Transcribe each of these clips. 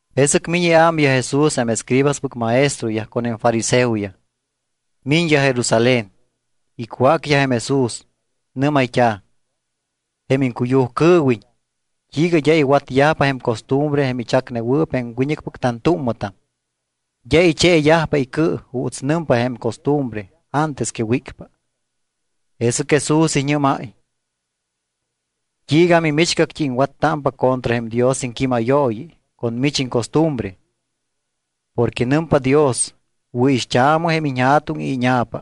Jesɨc miñ iámyaj Jesús jém escribaspɨc maestroyaj con jém fariseoyaj. Miñyaj Jerusalén. Icwácyaj jém Jesús. Nɨ́mayt́a̱: —Jém iŋcuyujcɨɨwiñ, ¿t́iiga d́a iwatyajpa jém costumbre jém ichacnewɨɨp jém wiñɨcpɨc tantúmmɨtam? D́a icheeyajpa icɨ juuts nɨmpa jém costumbre antes que wícpa. Jesɨc Jesús iñɨ́máy: —¿T́iiga mimichgact́i iŋwattámpa contra jém Dios iŋquímayooyi con mich iŋcostumbre? Porque nɨmpa Dios: “Wɨ̱ixt́aamɨ jém iñja̱tuŋ y íña̱pa.”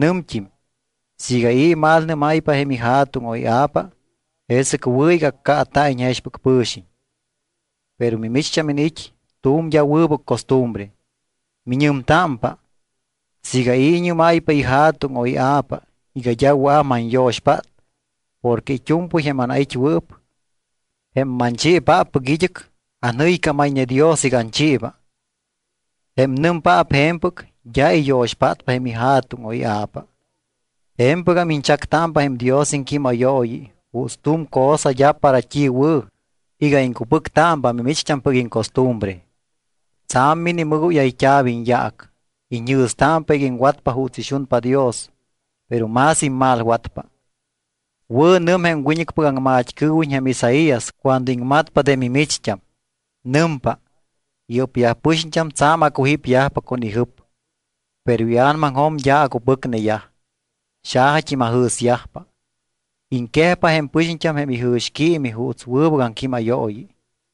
Nɨmt́im: “Siiga i̱ imalnɨ́máypa jém ija̱tuŋ o ia̱pa, jesɨc wɨ̱ iga accaata̱iñ jexpɨc pɨ̱xiñ.” Pero mimicht́am iniit́ tu̱m d́a wɨbɨc costumbre. Miñɨmtámpa: “Siiga i̱ iñɨ́máypa ija̱tuŋ o ia̱pa iga d́a wɨa̱p manyo̱xpát porque it́u̱mpɨy jém anait́wɨɨp, jém manchiipáppɨc id́ɨc, anjɨycámayñe Dios iga anchiiba.” Jém nɨmpaap je̱mpɨc d́a iyo̱xpátpa jém ija̱tuŋ o ia̱pa. Je̱mpɨgam iñchactámpa jém Dios iŋquímayooyi juuts tu̱m cosa d́a para t́i wɨ̱ iga iŋcupɨctámpa mimicht́ampɨc iŋcostumbre. Tsa̱m minimɨgóyayt́a̱p iñyaac. Iñjɨ̱stámpa iga iŋwatpa juuts ixunpa Dios, pero más immalwatpa. Wɨ̱ nɨm jém wiñɨcpɨc aŋmat́cɨɨwiñ jém Isaías cuando iŋmatpa de mimicht́am. Nɨmpa: Yɨ́pyaj pɨxiñt́am tsa̱m acujípyajpa con ijɨp. Pero ia̱namaŋjo̱m d́a acupɨcneyaj. Xajat́im ajɨ̱syajpa. Iŋquejpa jém pɨxiñt́am jém ijɨ̱xquiimi juuts wɨbɨc aŋquímayooyi.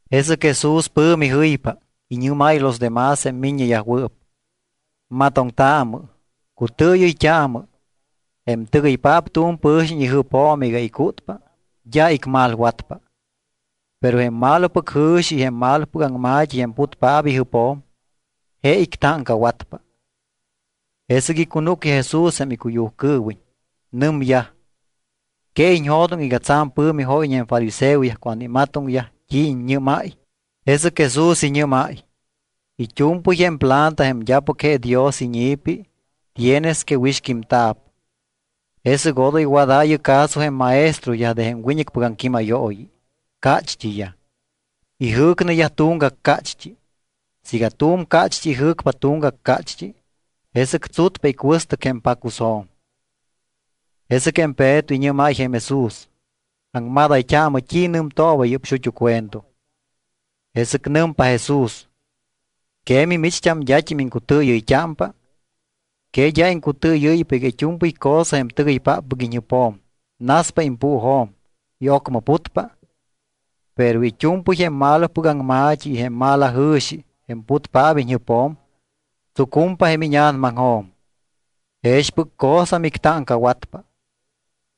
Jesɨc Jesús pɨ̱mi jɨypa. Iñɨ́máy los demás jém miññeyajwɨɨp: —Matoŋtaamɨ. Cutɨɨyɨyt́aamɨ. Jém tɨgɨypaap tu̱m pɨ̱xiñ ijɨpjo̱m iga icútpa, d́a icmalwatpa. Pero jém malopɨc jɨ̱xi y jém malopɨc aŋma̱t́i jém putpaap ijɨpjo̱m, je ictáŋcawatpa. Jesɨc icunúcyaj Jesús jém icuyujcɨɨwiñ. Nɨmyaj: —¿Que iñjo̱doŋ iga tsa̱m pɨ̱mi jóyñe jém fariseoyaj cuando imatoŋyaj t́i iññɨ́máy? Jesɨc Jesús iñɨ́máy: —It́u̱mpɨy jém planta jém d́apɨc je Dios iñi̱pi tienes que wixquímta̱p. Jesɨc odoy wadaayɨ caso jém maestroyaj de jém wiñɨcpɨc aŋquímayooyi. Cácht́iyaj. Ijɨ̱cneyaj tuŋgac cácht́i. Siiga tu̱m cácht́i ijɨ̱cpa tuŋgac cácht́i, jesɨc tsutpa icuɨstɨc jém pacusjo̱m. Jesɨc jém Peto iñɨ́máy jém Jesús: —Aŋmadayt́aamɨ t́i nɨmtooba yɨ́p xut́u cuento. Jesɨc nɨmpa Jesús: —¿Que mimicht́am, d́at́im iŋcutɨɨyɨyt́ámpa? ¿Que d́a iŋcutɨɨyɨ́ypa iga it́u̱mpɨy cosa jém tɨgɨypáppɨc iñjɨpjo̱m naspa impuujo̱m y ocmɨ putpa? Pero it́u̱mpɨy jém malopɨc aŋma̱t́i y jém malajɨ̱xi jém putpaap iñjɨpjo̱m tsucumpa jém íña̱namaŋjo̱m. Jexpɨc cosa mictáŋcawatpa.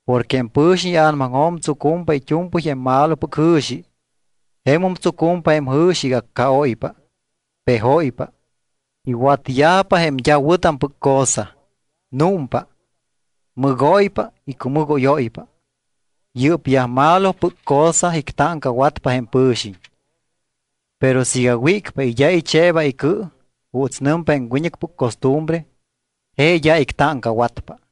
Porque jém pɨ̱xiñ ia̱namaŋjo̱m tsucumpa it́u̱mpɨy jém malopɨc jɨ̱xi. Jemum tsucumpa jém jɨ̱xi iga accaóypa, pejóypa, iwatyajpa jém d́a wɨ̱tampɨc cosa, númpa, mɨgóypa y cumɨgóyóypa. Yɨ́pyaj malopɨc cosa ictáŋcawatpa jém pɨ̱xiñ. Pero siiga wícpa y d́a icheeba icɨ juuts nɨmpa jém wiñɨcpɨc costumbre, je d́a ictáŋcawatpa.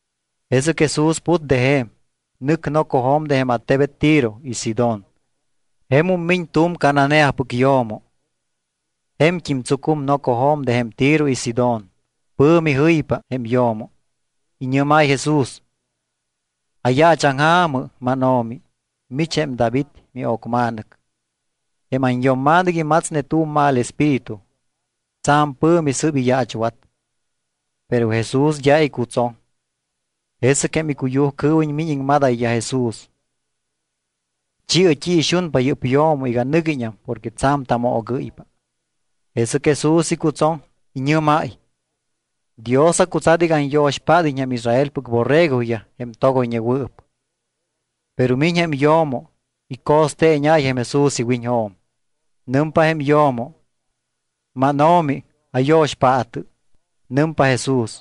Jesɨc Jesús put de je̱m, nɨc nocojo̱m de jém attebet Tiro y Sidón. Jemum miñ tu̱m Cananeapɨc yo̱mo. Je̱mt́im tsucum nocojo̱m de jém Tiro y Sidón. Pɨ̱mi jɨypa jém yo̱mo. Iñɨ́máy Jesús: —Ayaachaŋja̱mɨ, mánO̱mi. Mich jém David mio̱cma̱nɨc. Jém anyo̱mma̱nɨc imatsne tu̱m mal espíritu. Tsa̱m pɨ̱mi sɨ́p iyaachwat. Pero Jesús d́a icutsoŋ. Jesɨc jém icuyujcɨɨwiñ miñ iñɨ́mayyaj Jesús: —Chi̱ɨ t́i ixunpa yɨ́p yo̱mo iga nɨguiñam porque tsa̱m tamoogɨ́ypa. Jesɨc Jesús icutsoŋ, iñɨ́máy: —Dios acutsat iga anyo̱xpád́iñ jém Israelpɨc borregoyaj jém togoyñewɨɨp. Pero miñ jém yo̱mo, ico̱steeñáy jém Jesús iwiñjo̱m. Nɨmpa jém yo̱mo: —MánO̱mi, ayo̱xpaatɨ. Nɨmpa Jesús: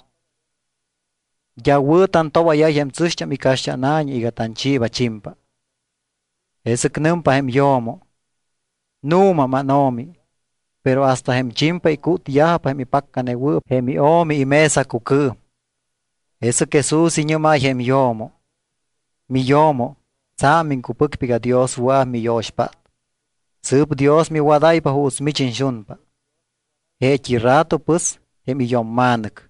—D́a wɨ̱ tantobáyáypa jém tsɨ̱xt́am icaxt́ána̱ñi iga tanchiiba chimpa. Jesɨc nɨmpa jém yo̱mo: —Nu̱ma, mánO̱mi, pero hasta jém chimpa icútyajpa jém ipaccanewɨɨp jém io̱mi imesacucɨɨm. Jesɨc Jesús iñɨ́máy jém yo̱mo: —Miyo̱mo, tsa̱m iŋcupɨcpa iga Dios wɨa̱p miyo̱xpát. Sɨɨp Dios miwadáypa juuts mich iñxunpa. Jeet́i rato pɨs jém iyo̱mma̱nɨc.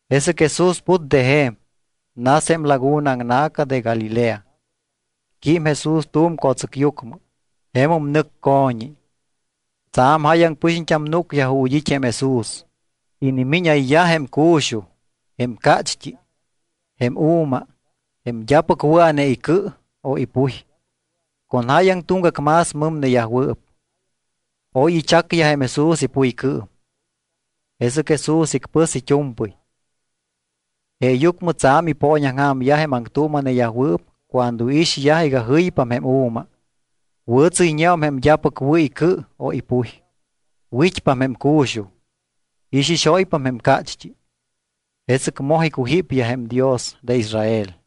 Jesɨc Jesús put de je̱m. Nas jém laguna aŋna̱ca de Galilea. Quím Jesús tu̱m co̱tsɨcyucmɨ. Jemum nɨc co̱ñi. Tsa̱m jáyaŋ pɨxiñt́am núcyaj ju̱t́ it́ jém Jesús. Inimíñayyaj jém cu̱xuj, jém cácht́i, jém u̱ma, jém d́apɨc wɨa̱ne icɨ o ipuy, con jáyaŋ tuŋgac más mɨmneyajwɨɨp. Oy ichacyaj jém Jesús ipuycɨɨm. Jesɨc Jesús icpɨs it́u̱mpɨy. Jeeyucmɨ tsa̱m ipooñaŋja̱myaj jém aŋtuuma̱neyajwɨɨp cuando iixyaj iga jɨypam jém u̱ma, wɨ̱tsɨ́yñeum jém d́apɨc wɨ̱ icɨ o ipuy, wit́pam jém cu̱xuj, ixixóypam jém cácht́i. Jesɨc moj icujípyaj jém Dios de Israel.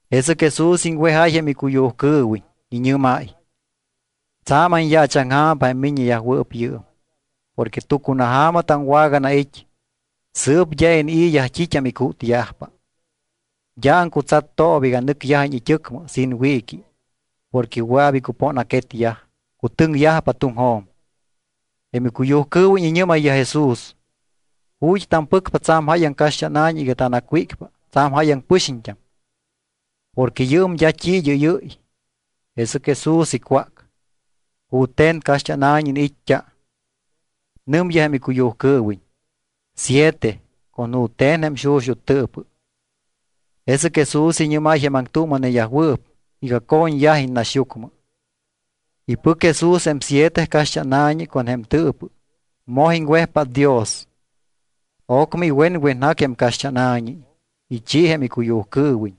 Jesɨc Jesús iŋwejáy jém icuyujcɨɨwiñ. Iñɨ́máy: —Tsa̱m anyaachaŋja̱mpa jém miññeyajwɨɨp yɨɨm. Porque tucunaja̱ma taŋwaganait́, sɨɨp d́a inii̱yaj t́it́am icútyajpa. D́a aŋcutsattooba iga nɨcyajiñ it́ɨcmɨ sin wiiqui porque wɨa̱p icupóna̱quetyaj, cutɨŋyajpa tuŋjo̱m. Jém icuyujcɨɨwiñ iñɨ́mayyaj Jesús: —¿Ju̱t́ tampɨcpa tsa̱m jáyaŋ caxt́ána̱ñi iga tanacwícpa tsa̱m jáyaŋ pɨxiñt́am? Porque yɨɨm d́a t́i id́ɨ́yɨ́y. Jesɨc Jesús icwác: —¿Jute̱n caxt́ána̱ñi iniit́t́a? Nɨmyaj jém icuyujcɨɨwiñ: —Siete, con jute̱n jém xuxut́ tɨɨpɨ. Jesɨc Jesús iñɨ́máy jém aŋtuuma̱neyajwɨɨp iga co̱ñyajiñ naxyucmɨ. Ipɨc Jesús jém siete caxt́ána̱ñi con jém tɨɨpɨ, moj iŋwejpát Dios. Ocmɨ iwenwenjac jém caxt́ána̱ñi, ichi jém icuyujcɨɨwiñ.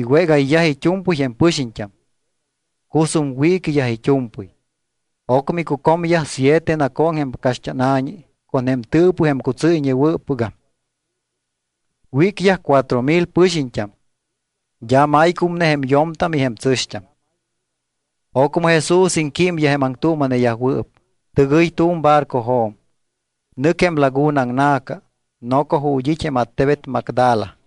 Iwégayyaj it́u̱mpɨy jém pɨxiñt́am. Cusum wiiquiyaj it́u̱mpɨy. Ocmɨ icucomyaj siete nacooŋ jém caxt́ána̱ñi con jém tɨɨpɨ jém cutsɨ́yñewɨ́ppɨgam. Wícyaj cuatro mil pɨxiñt́am, d́a maycumne jém yo̱mtam y jém tsɨ̱xt́am. Ocmɨ Jesús iŋquímyaj jém aŋtuuma̱neyajwɨɨp, tɨgɨy tu̱m barcojo̱m, nɨc jém laguna aŋna̱ca noco ju̱t́ it́ jém attebet Magdala.